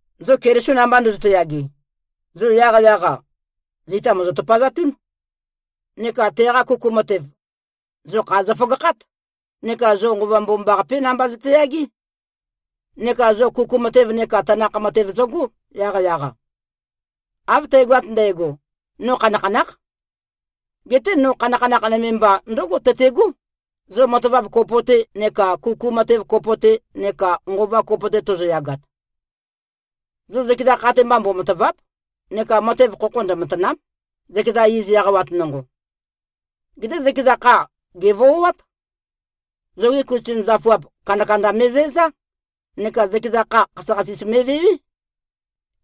Zo Keliso namba ndøzøte-yage, zo yaqyaq-a, zita mòzo-tøpøzatún. Neka teqa kuku matev, zo kha zøføgakhát. Neka zo Nqova Mbomambaqapé namba zøteyagé. Neka zo kuku matev neka tanakh matev zøgó, yaqyaq-a. Av tægoat ndægo, no khanakhanákh. Geté no khanakhanakh nøme mba ndǿgo tøté꞉gó, zo matavap kopo-te neka kuku matev kopo-te neka nqova kopo-te tozoyagat. Zo zøkeza kha mba, mbomatàva᷄p neka matev khokho ndømatàna᷄m, zøkeza iz eqawat nonqo. Geté zøkeza kha, gèvoát. Zogi Klisten zøfuap, kandakanda me꞉zæzá, neka zøkeza kha, khasøkhasis me꞉vewé.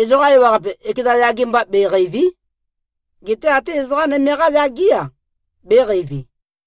Ezoqa ewaqape, ekeza yage mba, be꞉qeìvi᷄. Geté até ezoqa nøme-qá yagé-a, bēqeivi.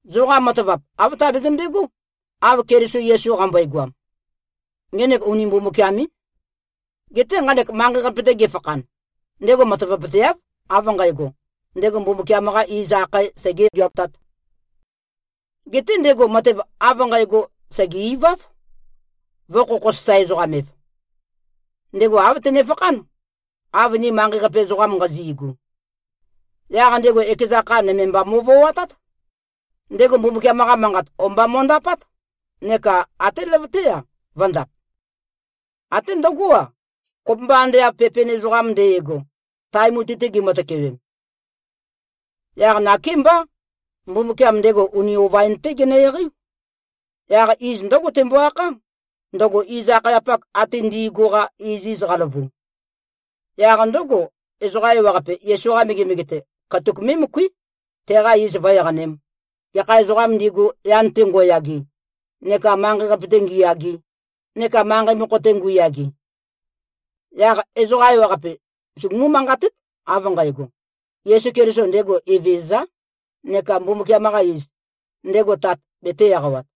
Zoqa matavap, āv tabezømbe꞉gó, av Keliso Yesu qambøegoam. Ngenek uni Mbumbukiam-ín. Geté nqanek manqei-qape-te gefakhan, ndego matavapøteáv, av nqægo, ndego Mbumbukiam-qa iz akhae segē-geatāt. Geté ndego matev av nqægo, sège-iváv, vø̄-khokho-sasae-ezoqam-ev. Ndego āv tenefakhán, av ni manqei-qape ezoqam nqazi꞉gu. Yaq ndego ekeza kha nøme mba mo꞉voatát. Ndego Mbumbukiam-qa manqat o-mba mo꞉ndapát, neka até løvøté-a, vø̄ndap. Até ndøgó-a, kopømba ande av pepen ezoqam nde꞉go, tae mutui-te gimø-tøkewem. Yaq nakémbá, Mbumbukiam ndego uni ova-in-té genø-eqeiú. Yaq iz ndǿgo tembo-akhá, ndøgo iz-akhayapak ate ndi꞉gu-qa iziz qaløvu. Yaq ndǿgo, ezoqa ewaqape, Yesu-qa megemege-te, katuk mé꞉møkuí, teqa iz vǿ-eqanēm, gekha ezoqām ndigu, yan-te ngo꞉yage, neka manqei-qape-te ngiyage, neka manqei mokho-te ngu꞉yage. Yaq ezoqa ewaqape sugumú-manqatét, av nqægo, “Yesu Keliso, ndego Evezøzá,” neka Mbumbukiam-qa iz, ndego Tat, betē-eqawat.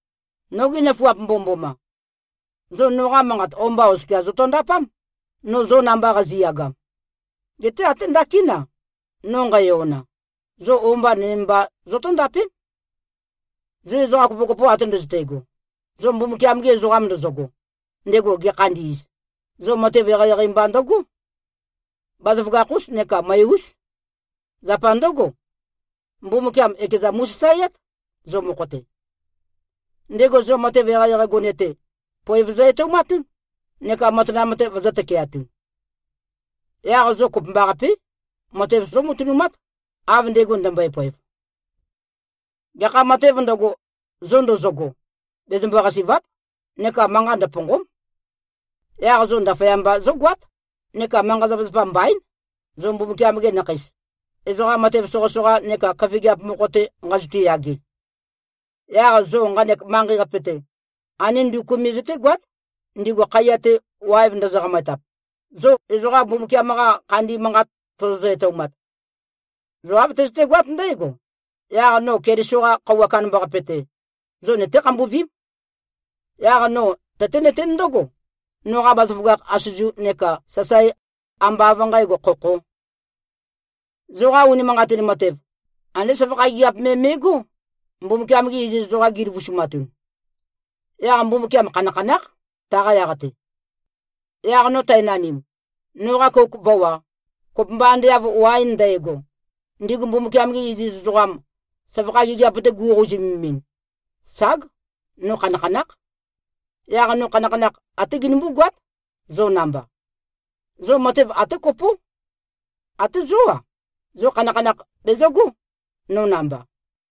Nogi nøfuap mbomømboma! Zo noqa manqat o-mba oskia zotondapám, no zo namba qazi꞉yagam. Geté até ndakin-a, no nqæyona, zo o-mba nøme mba zotóndapém. Zo ezoqa kopokopo ate ndøzøte꞉go, zo Mbumbukiam-gi ezoqam ndozogo, ndego gekhandi꞉z, zo matev eqeieqei mba ndøgó. Bazaføgakh-ús neka møe-ús. Zapa ndǿgo, Mbumbukiam ekeza mu꞉sasaeát, zo mokho-te. Ndego zo matev eqeieqei gone-te, poev zø-etoumatún, neka matanam-te vøzø̄-tøkeatun. Yaq zo kopømbaqapé, matev zómatønumát, av ndego ndømbøe-poev. Gekha matēv ndøgo, zo ndozogo, bezømbo-qasì꞉va᷄p neka manqa ndøpònqo᷄m. Yaq zo ndaføyamba zógoát, neka manqa-zapazapa mbaín, zo Mbumbukiam-gi nakheis, ezoqa matev soqøsoqa neka køfigiap mokho-te nqazotu꞉-yage. Yaq zo nqanek manqei-qape-te, andé nduku me zøtégoát, ndigu khaiya-te, waev ndøzø-qamøetap, zo ezoqa Mbumbukiam-qa khandi manqat tozozø-etoumat. Zo av tøzøtegoat ndægo, yaq no Keliso-qa Khøuwa Kandambaqape-te, zo nøté-khambuvím. Yaq no tøténøtén ndǿgo, noqa bazaføgakh asøzu neka sasae, ambá av nqǣgo, khokhō. Zoqa unimanqatin matev, andé søvakha gigiap me me꞉gó, Mbumbukiam-gi iziz ezoqam, gi꞉løvusumatun. Yaq Mbumbukiam khanakhanákh, taqa yaq-te. Yaq no tænanim, noqa kouk vǿwā, kopømba ande av waen ndægo, ndigu Mbumbukiam-gi iziz ezoqam, søvakha gigiap-te go꞉qouzumemin, ság, no khanakhanákh. Yaq no khanakhanakh, até genømbú-goát, zo namba. Zo matev até kopó. Até zó-a, zo khanakhanakh bezøgó, no namba.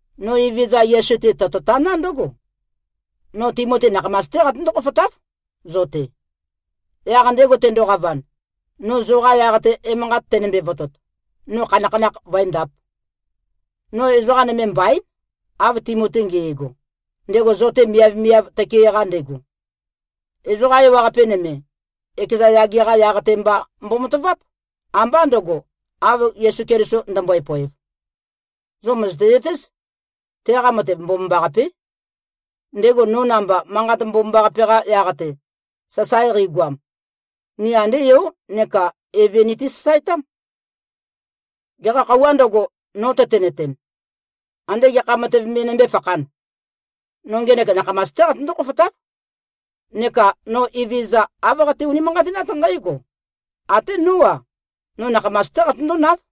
No Evezøza Yesu-te, tototaná ndǿgo: No Timoti nakhamas-té qatøndó-khofotáv zo-te. Yaq ndego tendoqavan, no zoqa yaq-te emanqat tenømbe-votot, no khanakhanakh vǿendāp. No ezoqa nøme mbaín, av Timoti nge꞉go, ndego zo-te miavmiav tøke-qa ndego. Ezoqa ewaqape nøme, ekeza yage-qa yaq-te mba mbomataváp, ambá ndø̄go, av Yesu Keliso ndømbøe-poev. Zo mø̀zøte-zøtéz, teqa matev mbomambaqapé. Ndego no namba, Manqat Mbomambaqape-qa yaq-te, sasae qeigoam, ni andé yo neka eve niti-sasaetám. Gekha khøuwā ndøgo, no tøtenøten, ande gekha matev me nømbé-fakhān, no ngenek nakhamas-té qatøndó-khofotáv. Neka no Evezøza, āv qate-unimanqatinát nqǽgo: Até nó-a, no nakhamas-té qatøndónáv.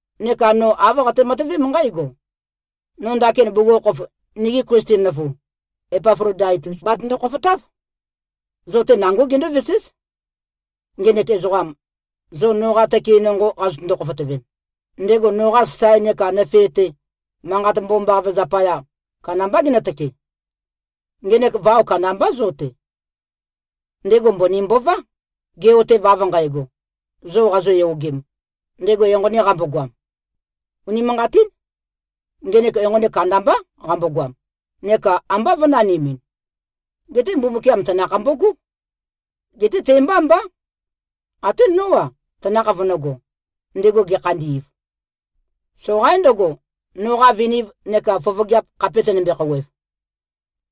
Neka no āv qate-matøvém nqǽgo: No ndakin bugukhokhof nigi Klisten nøfu, Epaflodaitus batøndo-khofotáv. Zo-te nangó gendóveséz. Ngenek ezoqam, zo noqa tøke nonqo qazøtøndo-khofotøvem, ndego noqa sasae neka nøfe-te, Manqat Mbomambaqape zapaya, kandambá genøtøke. Ngenek vao kandambá zo-te. Ndego mbøni mbová, ge꞉-otev, av nqægo, zo qazoyogem, ndego enqoni qambogoam. Unimanqatín. Ngenek enqoni kandambá qambogoam, neka ambá vø̄nanimin. Geté Mbumbukiam tanakh mbogó. Geté te-mbá mbá. Até nó-a, tanakh vønø̄go, ndego gekhandi꞉v. Soqaín ndøgo, noqa viniv neka fofogeap khape tønømbe-khouwev.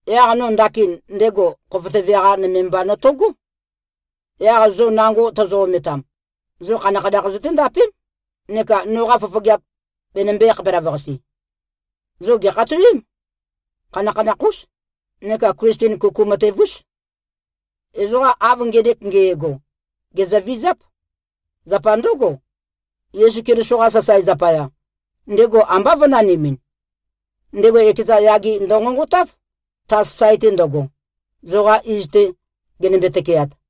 Yaq no ndakin ndego khofotøve-qa nøme mba notogó. Yaq zo nango tozomø-ometam, zo khanakhanakh zøténdapém, neka noqa fofogeap benømbē-khapelavøqase. Zo gèkhatowém. Khanakhanakh-ús neka Klisten kuku matev-ús. Ezoqa, av ngenek nge꞉go, gèzøvizáp. Zapa ndǿgo, Yesu Keliso-qa sasae zapaya, ndego ambá vø̄nanimin. Ndego ekeza yage ndønqonqotáv, ta sasae-te ndøgo, zoqa iz-te genømbe-tøkeat.